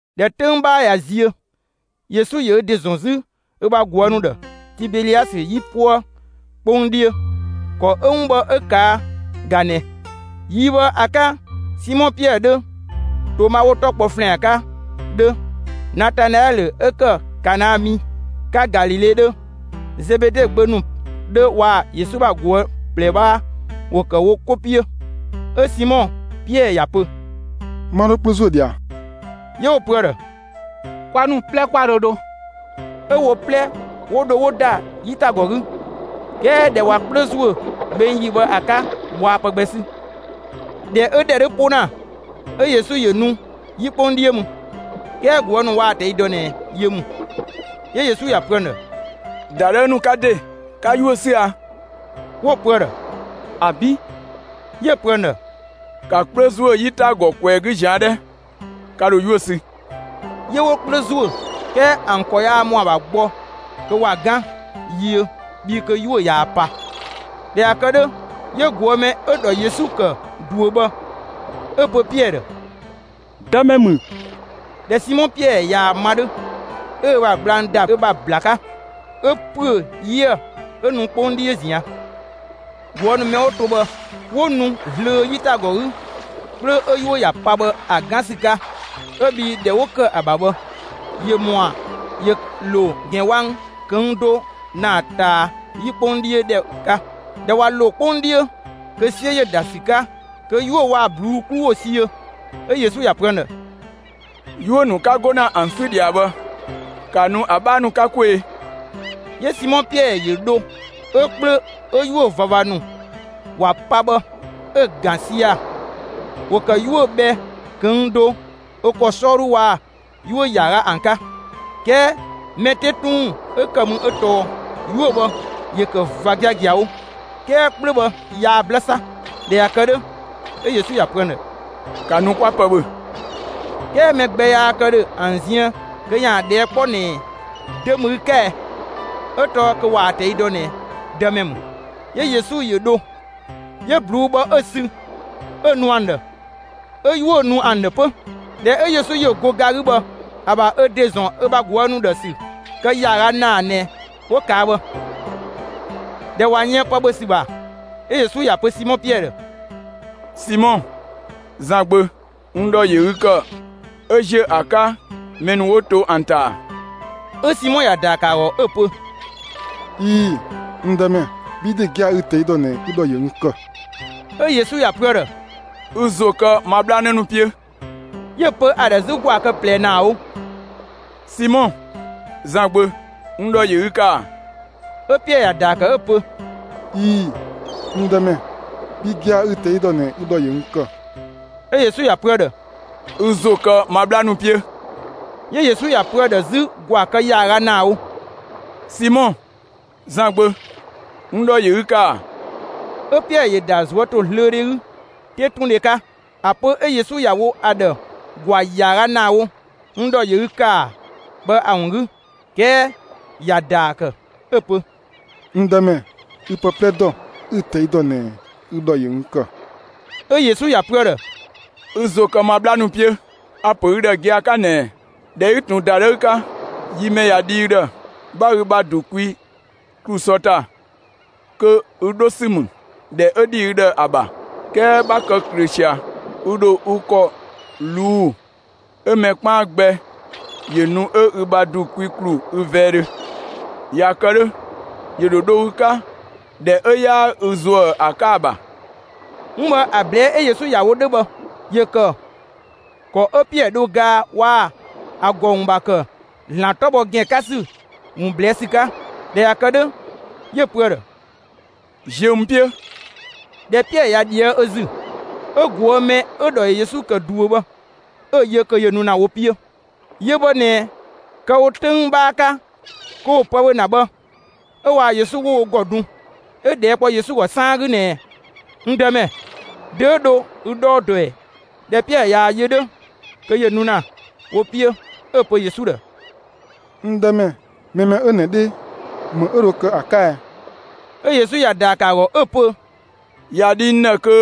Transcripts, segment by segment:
꞊Dhɛ 'töng 'bhaa ꞊ya ziö, Yesu ‑yö ö ‑de ‑zɔn 'zü ö ‑bha ꞊guë' ‑nu ‑dhë, Tibeliasë 'yipuë 'kpong 'dhiö. ‑Kɔ 'ö 'wun bhë 'ö ꞊kaa' ꞊ga ꞊nɛɛ: Yi bhë ‑a 'ka, Simɔ Piɛɛ 'dhö, Toma ('wo‑ 'tɔ kpɔ ‑Flɛan 'ka) 'dhö, Natanaɛlö ('ö ‑kë Kana mi 'ka Galile) 'dhö, Zebede gbö ‑nu 'dhö waa‑ Yesu ‑bha ꞊guë' ꞊plɛ 'bhaa ‑wo ‑kë wo 'ko 'piö. 'Ö Simɔ Piɛɛ ‑ya pö: «'Ma 'dho 'kplö ‑zuö ꞊dhia.» 'Yö 'wo‑ pö ‑a ‑dhë: «Kwa ‑nu 'plɛ 'kwa dho dho.» 'Ö wo 'plɛ 'wo dho 'wo ‑da 'yitagɔ 'gü. 'Kɛɛ ꞊dhɛ ꞊wa 'kplö ‑zuö gbeng ‑yi bhë ‑a 'ka, waa pë gbɛ 'sü. ꞊Dhɛ 'ö‑ ‑dhɛ 'dhö 'po ‑na, 'ö Yesu ‑yö nu 'yi 'kpong 'dhiö mü. 'Kɛɛ ꞊guë' ‑nu waa‑ ꞊tɛi' dɔ ꞊nɛ yö ‑mü. 'Yö Yesu ‑ya pö ‑an ‑dhë: «‑Dadhëü ‑nu 'ka ‑de, ka 'yuö‑ ‑sü ‑a?» 'Wo‑ pö ‑a ‑dhë: «‑Abi'!» 'Yö‑ pö ‑an ‑dhë: «Ka 'kplö ‑zuö 'yitagɔ ꞊kwɛɛ‑ 'gü ꞊zian' 'dhɛ, ka ‑dho 'yuö‑ sü.» 'Yö 'wo 'kplö ‑zuö, 'kɛɛ ‑an ‑kɔ yaa ‑mɔa ‑bha gbɔ kö ‑wa 'gan yiö bhii kö 'yuö‑ ꞊yaa‑ pa. ꞊Dhɛ ꞊ya kë 'dhö, 'yö ꞊guë' mɛ 'ö‑ ‑dhɔ Yesu ‑kë ꞊duö bhë, 'ö‑ pö Piɛɛ ‑dhë: «Dëmɛ ‑mü!» ꞊Dhɛ Simɔ Piɛɛ ꞊yaa‑ ma 'dhö, 'ö ö ‑bha gblang ‑da ö ‑bha ‑bla 'ka, 'ö ‑püö 'yiëë‑, 'ö nu 'kpong 'dhiö ꞊zian'. ꞊Guë' ‑nu mɛ 'wo to bhë 'wo nu zlöö 'yitagɔ 'gü 'kplö 'ö 'yuö‑ ‑ya pa bhë ‑a 'gan ‑sü 'ka, 'ö bhii ‑dhɛ 'wo ‑kë ‑a ‑bha bhë ‑yö ‑mɔa ‑yö ‑lo ‑gɛn wang ꞊këng' do ‑naa ꞊taa 'yi 'kpong 'dhiö ‑dhɛ 'ka. ꞊Dhɛ ꞊wa ‑lo 'kpong 'dhiö, kö 'siö ‑yö ‑da ‑sü 'ka, kö 'yuö‑ waa‑ ꞊bluu'‑ 'klu ‑wo siöö. 'Ö Yesu ‑ya pö ‑an ‑dhë: «'Yuö‑ ‑nu 'ka 'go ‑na ‑an 'sü ꞊dhia bhë, ‑ka nu ‑a 'bhaa ‑nu 'ka 'kwee‑!» 'Yö Simɔ Piɛɛ ‑yö dho 'ö 'kplö 'ö 'yuö‑ ꞊vava ‑nu ‑wa pa bhë, 'ö‑ ‑gan sia‑; ‑wo ‑kë 'yuö‑ bhɛ ꞊këng' do ö ‑kɔ 'sɔɔdhu waa‑ 'yuö‑ ‑yaaga ‑an 'ka. 'Kɛɛ mɛ 'te 'tun ‑wun 'ö ‑kë mü 'ö tɔɔ 'yuö‑ bhë ‑yö ‑kë ꞊va giagiawo, 'kɛɛ 'kplö bhë yaa 'blë 'sa. ꞊Dhɛ ꞊ya kë 'dhö, 'ö Yesu ‑ya pö ‑an ‑dhë: «‑Ka nu 'kwa pë ‑bhö.» 'Kɛɛ mɛ gbɛ yaa kë ‑dhö ‑an ziën kö ‑yaan ꞊dhɛɛ' 'kpɔ ꞊nɛɛ: «Dö ‑mü ü 'ka ɛ?» 'Ö tɔɔ kö ꞊waa‑ ꞊tɛi' dɔ ꞊nɛ Dëmɛ ‑mü. 'Yö Yesu ‑yö dho, 'yö ꞊bluu'‑ bhë 'ö‑ sü, 'ö‑ nu ‑an ‑dhë; 'ö 'yuö‑ nu ‑an ‑dhë 'pö. ꞊Dhɛ 'ö Yesu ‑yö go ga 'gü bhë, ‑a ‑bha ö ‑de ‑zɔn ö ‑bha ꞊guë' ‑nu ‑dhë ‑sü kë ‑yaaga ‑naa ꞊nɛ 'wo ꞊kaa' bhë. ꞊Dhɛ ꞊wa yën pë ‑bhö ‑sü ‑bha, 'ö Yesu ‑ya pö Simɔ Piɛɛ ‑dhë: «Simɔ, Zan gbö, n ‑dhɔ ‑yö ü ‑kë 'ö ‑ziö ‑a 'ka mɛ ‑nu 'wo to ‑an ‑ta ‑a?» 'Ö Simɔ ‑ya ‑daa ‑kë ‑a ‑gɔ 'ö‑ pö: «꞊Ii‑, n Dëmɛ; bhi ‑de gia‑ ü‑ ꞊tɛi' ‑dɔ ꞊nɛ ü ‑dhɔ ‑yö n ‑kë.» 'Ö Yesu ‑ya pö ‑a ‑dhë: «Ü ‑zo kë ma 'bhla 'në ‑nu 'piö.» 'Yö‑ pö ‑a ‑dhë 'zü ‑gwaa kë ꞊plɛ ‑naa wo: «Simɔ, Zan gbö, n ‑dhɔ ‑yö ü ‑kë ‑a?» 'Ö Piɛɛ ‑ya ‑daa ‑kë 'ö‑ pö: «꞊Ii‑, n Dëmɛ; bhi gia‑ ü‑ ꞊tɛi' ‑dɔ ꞊nɛ ü ‑dhɔ ‑yö n ‑kë.» 'Ö Yesu ‑ya pö ‑a ‑dhë: «Ü ‑zo kë ma 'bhla ‑nu 'piö.» 'Yö Yesu ‑ya pö ‑a ‑dhë 'zü ‑gwaa kë ‑yaaga ‑naa wo: «Simɔ, Zan gbö; n ‑dhɔ ‑yö ü ‑kë ‑a?» 'Ö Piɛɛ ‑yö ‑da ꞊zuötozlöödhe 'gü 'tetundhe 'ka ‑a pö 'Ö Yesu ‑ya wo ‑a ‑dhë ‑gwaa ‑yaaga ‑naa wo «n ‑dhɔ ‑yö ü ‑kë ‑a?» bhë ‑a ‑wun 'gü. 'Kɛɛ ‑ya ‑daa ‑kë 'ö‑ pö: «N Dëmɛ, ü pë 'plɛ ‑dɔ; ü‑ ꞊tɛi' ‑dɔ ꞊nɛ ü ‑dhɔ ‑yö n ‑kë.» 'Ö Yesu ‑ya pö ‑a ‑dhë: «Ü ‑zo kë ma 'bhla ‑nu 'piö. A‑ ‑pö ü ‑dhë gia‑ 'ka ꞊nɛɛ: ꞊Dhɛ 'ü ꞊tun ‑dadhëü 'ka, (yi mɛ ꞊ya dhi ü ‑dhë,) 'bha ü ‑bha ‑du kwi ‑klu sɔ ‑ta, kö ü 'dho ‑sü ‑mü ‑dhɛ 'ö ‑dhi ü ‑dhë ‑a ‑bha; 'kɛɛ 'bha kë ꞊klöö ꞊sia, ü ‑dho ü ‑kɔ ꞊luu'‑ 'ö mɛ 'kpaan gbɛ ‑yö nu 'ö ü ‑bha ‑du kwi ‑klu ü vɛɛdhö. ꞊Ya kë 'dhö, ‑yö ‑dho dho ü 'ka ‑dhɛ 'ö 'yaa ü ‑zuë ‑a 'ka ‑a ‑bha.» 'Wun bhë ‑a ꞊blɛɛ' 'ö Yesu ‑ya wo 'dhö bhë, ‑yö ‑kë ‑kɔ 'ö Piɛɛ dhö gaa waa‑ ‑a ‑gɔ ‑wun ‑bha ‑kë ‑Zlan 'tɔ bhɔ ‑gɛn 'ka ‑sü ‑wun ꞊blɛɛ' sü 'ka. ꞊Dhɛ ꞊ya kë 'dhö, 'yö‑ pö ‑a ‑dhë: «Ziö n 'piö!» ꞊Dhɛ Piɛɛ ꞊ya ꞊dhië' ö ‑zü, 'ö ꞊guë' mɛ 'ö‑ ‑dhɔ ‑yö Yesu ‑kë ꞊duö bhë 'ö‑ yö kö ‑yö nu ‑na wo 'piö. Yö bhë ꞊nɛ kë‑ wo 'töng 'bhaa 'ka kö ‑wo pë ‑bhö ‑na bhë, 'ö waa‑ Yesu 'wo wo ‑gɔ dun, 'ö ꞊dhɛɛ' kpɔ Yesu ‑gɔ 'saan 'gü ꞊nɛɛ: «N Dëmɛ, dö 'ö dho ü 'dhɔɔ dɔ ꞊ɛ?» ꞊Dhɛ Piɛɛ ꞊yaa‑ yö 'dhö kö ‑yö nu ‑na wo 'piö, 'ö‑ pö Yesu ‑dhë: «N Dëmɛ, mɛ mɛ 'ö ꞊nɛ 'dhe, ‑më 'ö dho kë ‑a 'ka ɛ?» 'Ö Yesu ‑ya ‑daa ‑kë ‑a ‑gɔ 'ö‑ pö: «꞊Ya dhi n ‑dhë kö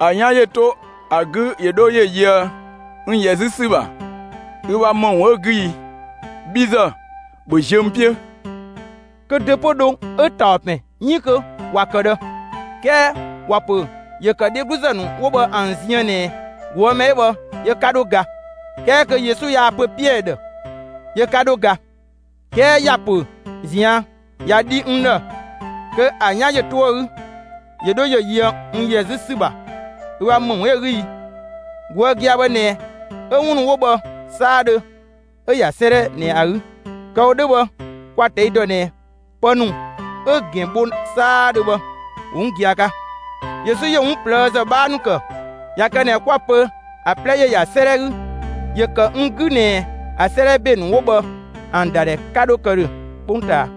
‑a 'yan ‑yö 'to ‑a 'gü ‑yö 'dho ‑yö yöë n ‑yɛ 'zü ‑sü ‑bha, ü ‑bha ‑më ‑wun 'ö‑ 'gü i? Bhi ‑zë, ‑bhö ziö n 'piö!» Kö dö 'pö dho 'ö ‑taɔ ‑pɛn 'iin kö ‑wa ‑kë ꞊dhë, 'kɛɛ ‑wa ‑pö ‑yö ‑kë dhegluzë ‑nu 'wo bhë ‑an ziën ꞊nɛ ꞊guë' mɛ 'ö bhë yö 'ka 'dho ga. 'Kɛɛ kö Yesu yaa‑ pö Piɛɛ ‑dhë: «Yö 'ka 'dho ga,» 'kɛɛ ‑ya pö ꞊zian': «꞊Ya dhi n ‑dhë kö ‑a 'yan ‑yö 'to ‑a 'gü ‑yö 'dho ‑yö yöë n ‑yɛ 'zü ‑sü ‑bha, ü ‑bha ‑më ‑wun 'ö‑ 'gü i?» ꞊Guë' gia‑ bhë ꞊nɛ 'ö 'wun ‑nu 'wo bhë 'saadhö 'ö‑ ‑ya 'sëëdhɛ ꞊nɛ ‑a 'gü; kë‑ wo 'dhö bhë, kwa‑ ꞊tɛi' ‑dɔ ꞊nɛ pë ‑nu 'ö‑ ‑gɛn bho 'saadhö bhë ‑wo 'wun gia‑ 'ka. Yesu ‑yö 'wun ꞊plëëzë 'bhaa ‑nu ‑kë. ꞊Ya kë ꞊nɛ 'kwa‑ pö ‑a 'plɛ ‑yö ‑ya 'sëëdhɛ 'gü, ‑yö ‑kë n 'gü ꞊nɛ ‑a 'sëëdhɛ ‑be ‑nu 'wo bhë ‑an ‑dadhɛ 'ka 'dho kë ‑dhö 'kpongtaa.